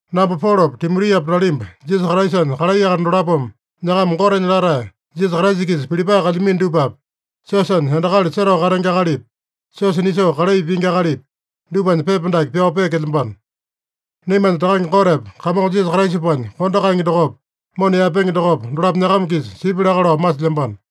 Namba Polopa, Timotiapa nalimba Jisasa Kraisanya kalai akali dolapome nyakama Gotenya latae, Jisasa Kraisa-kisa Pilipae kalyamino dupapi, siosanya endakali setao katenge akalipi, siosa nisoo kalai pingi akalipi, dupanya pepa dake pyao peekelyambano. Naimanya Takange Gotepa Kamongo Jisasa Kraisapanya kondo kaenge dokopa, mona yaepenge dokopa, dolapo nyakama-kisa sipya laka lao masilyambano.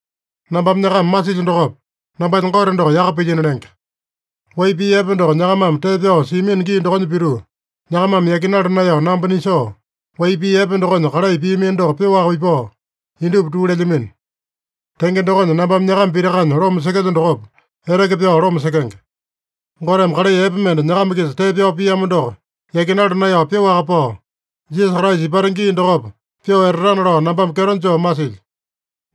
Nambame nyakama masilyo dokopa, nambanya Gote doko yaka pilyino lenge. Wai pii epe doko nyakamame tee pyao siamino gii dokonya pituu, nyakamame yakinala naeyao namba nisoo, wai pii epe dokonya kalai piamino doko pyoaka ipao, indupa tuu lelyamino. Tenge dokonya, nambame nyakama pitakanya loma sekelyo dokopa, eteke pyao loma sekenge. Goteme kalai epe mende nyakama-kisa tee pyao piamo doko yakinala naeyao pyoaka pao, Jisasa Kraisa ipata gii dokopa pyoo etatana lao nambame kyeto joo masilyo.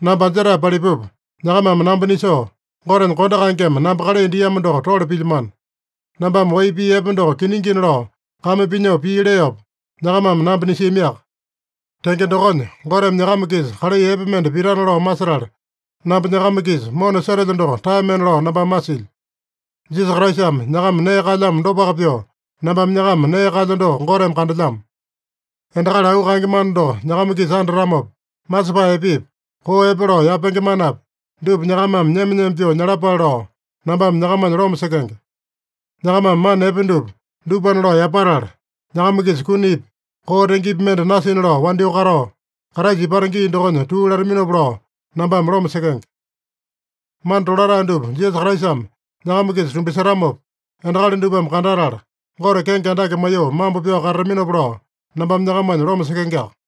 Namba anjetae palipupa, nyakamame namba nisoo, Gotenya kondo kaengeme namba kalai diamo doko tole pilyamano. Nambame wai pii epe doko kiningina lao kame pinyoo pii leopa, nyakamame namba nisiamiaka. Tenge dokonya, Goteme nyakama-kisa kalai epe mende pitana lao masetala, namba nyakama-kisa mona setelyo doko taemena lao nambame masilyo. Jisasa Kraisame nyakama nee kaelyamo dopaka pyoo, nambame nyakama nee kaelyo doko Goteme kandelyamo. Endakali auu kaenge mana doko nyakama-kisa andatamopa, masepae epepi, koo epe lao yapenge manapi, dupa nyakamame nyema-nyema pyoo nyalapale lao, nambame nyakamanya loma sekenge. Nyakamame mana epe dupa, dupana lao yapatala, nyakama-kisa kunipi, koo tengepi mende nasina lao wandyoo katao, Kraisa ipata gii dokonya tuu lataminopa lao, nambame loma sekenge. Mana tolatae dupa Jisasa Kraisame nyakama-kisa tumbasetamopa, endakali dupame kandatala Gote kenge andake maiyoo mambo pyao katataminopa lao, nambame nyakamanya loma sekengeaka.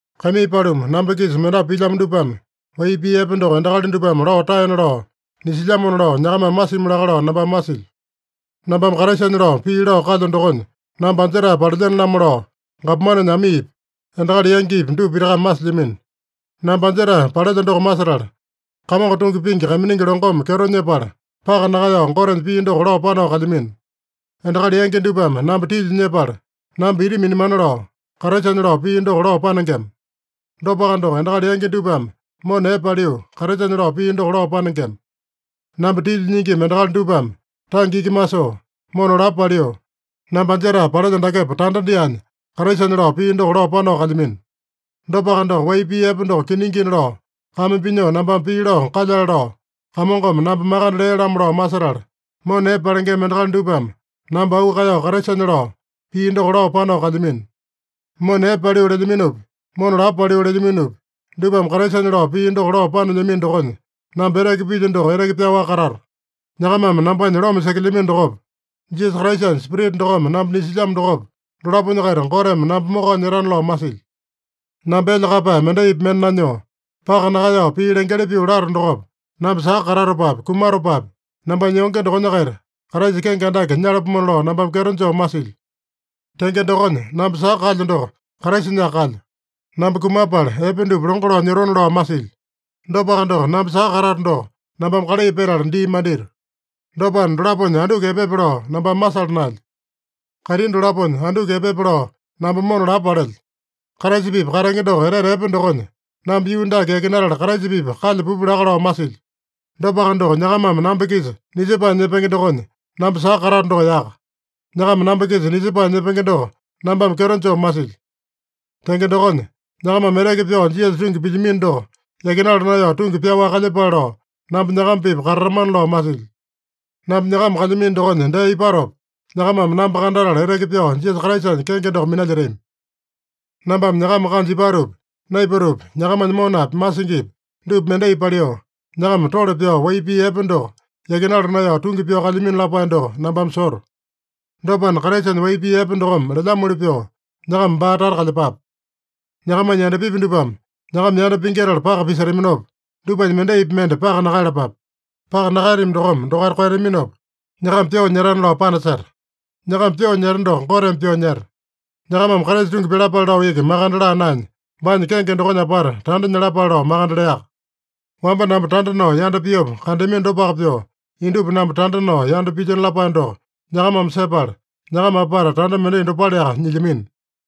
Kaimii paluma, namba-kisa mendapu pilyamo dupame wai pii epe doko endakali dupame lao taena lao nisilyamona lao, nyakamame masimi laka lao nambame masilyo. Nambame Kraisanya lao pii lao kalyo dokonya namba anjetae palelyene-lamo lao, gapomanenya amiipi, endakali yangipi, dupa pitakame masilyamino. Namba anjetae palelyo doko masetala, Kamongo tungi pingi kaiminingi longome kyeto nyepala, paka nakaeyao Gotenya pii doko lao panao kalyamino. Endakali yangi dupame namba tilya nyepala, namba ita minamana lao, Kraisanya lao pii doko lao panengema. Dopaka doko, endakali yangi dupame mona epe paliu, Kraisanya lao pii doko lao panengema. Namba tilya nyingima endakali dupame tange iki masoo, mona lapo paliu, namba anjetae palelyo dakepa tanda dyaanya, Kraisanya lao pii doko lao panao kalyamino. Dopaka doko, wai pii epe doko kiningina lao kame pinyoo nambame pii lao kalyale lao, Kamongome namba makande lea-lamo lao masetala, mona epe palengema endakali dupame namba auu kaeyao Kraisanya lao pii doko lao panao kalyamino. Mona epe paliu lelyaminopi, mona lapo paliu lelyaminopi, dupame Kraisanya lao pii doko lao panelyamino dokonya, namba eteke pilyo doko eteke pyaowaka katato. Nyakamame nambanya loma sekelyamino dokopa, Jisasa Kraisanya Spirita dokome namba nisilyamo dokopa, dolaponya-kaita Goteme namba mokao nyetana lao masilyo. Namba elya kaeyapae mendaipi mende nanyoo, paka nakaeyao pii lengeli pyoo lato dokopa, namba saka katatopapi, kumatopapi, nambanya yonge dokonya-kaita Kraisa kenge andake nyalapomona lao nambame kyeto joo masilyo. Tenge dokonya namba saka kalyo doko, Kraisanyaka kalyo. Namba kumapala epe dupa longo lao nyotona lao masilyo. Dopaka doko, namba saka katato doko, nambame kalai petala dii mandito. Dopana, dolaponya anduku epepe lao nambame masala naelyo. Kaitini dolaponya anduku epepe lao namba mona lapo palelyo. Kraisa-pipa katenge doko etete epe dokonya, namba yuu dake yakinatala Kraisa-pipa kalya pupu laka lao masilyo. Dopaka doko, nyakamame namba-kisa nisepae nyepenge dokonya, namba saka katato doko yaka. Nyakama namba-kisa nisepae nyepenge doko nambame kyeto joo masilyo. Tenge dokonya, nyakamame eteke pyao Jisasa tungi pilyamino doko yakinala naeyao tungi pyaowaka kalyepale lao, namba nyakama-pipa katatamana lao masilyo. Namba nyakama kalyamino dokonya dee ipatopa, nyakamame namba kandatala eteke pyao Jisasa Kraisanya kenge doko minalyetami. Nambame nyakama kanja ipatopi, naipatopi, nyakamanya monapi, masingipi dupa mendai paliu, nyakama tole pyao wai pii epe doko yakinala naeyao tungi pyao kalyamino lapae doko nambame soto. Dopana, Kraisanya wai pii epe dokome lelyamoli pyoo, nyakama baa tata kalyepape. Nyakamanya yandapipi dupame nyakama yanda pingyetala paka pisetaminopa, dupanya mendaipi mende paka nakaeyalapape. Paka nakaeyatami dokome dokaita koeyataminopa, nyakama pyoo nyetana lao panaseta. Nyakama pyoo nyeta doko, Goteme pyoo nyeta. Nyakamame Kraisa tungi pyalapale lao iki makande laa naenya, baanya kenge dokonya apata tanda nyalapale lao makande leaka. Wamba namba tanda nao yanda piopa kandeamino dopaka pyoo, indupa namba tanda nao yanda pilyino lapae doko nyakamame sepala, nyakama apata tanda mendai dopaleaka nyilyamino.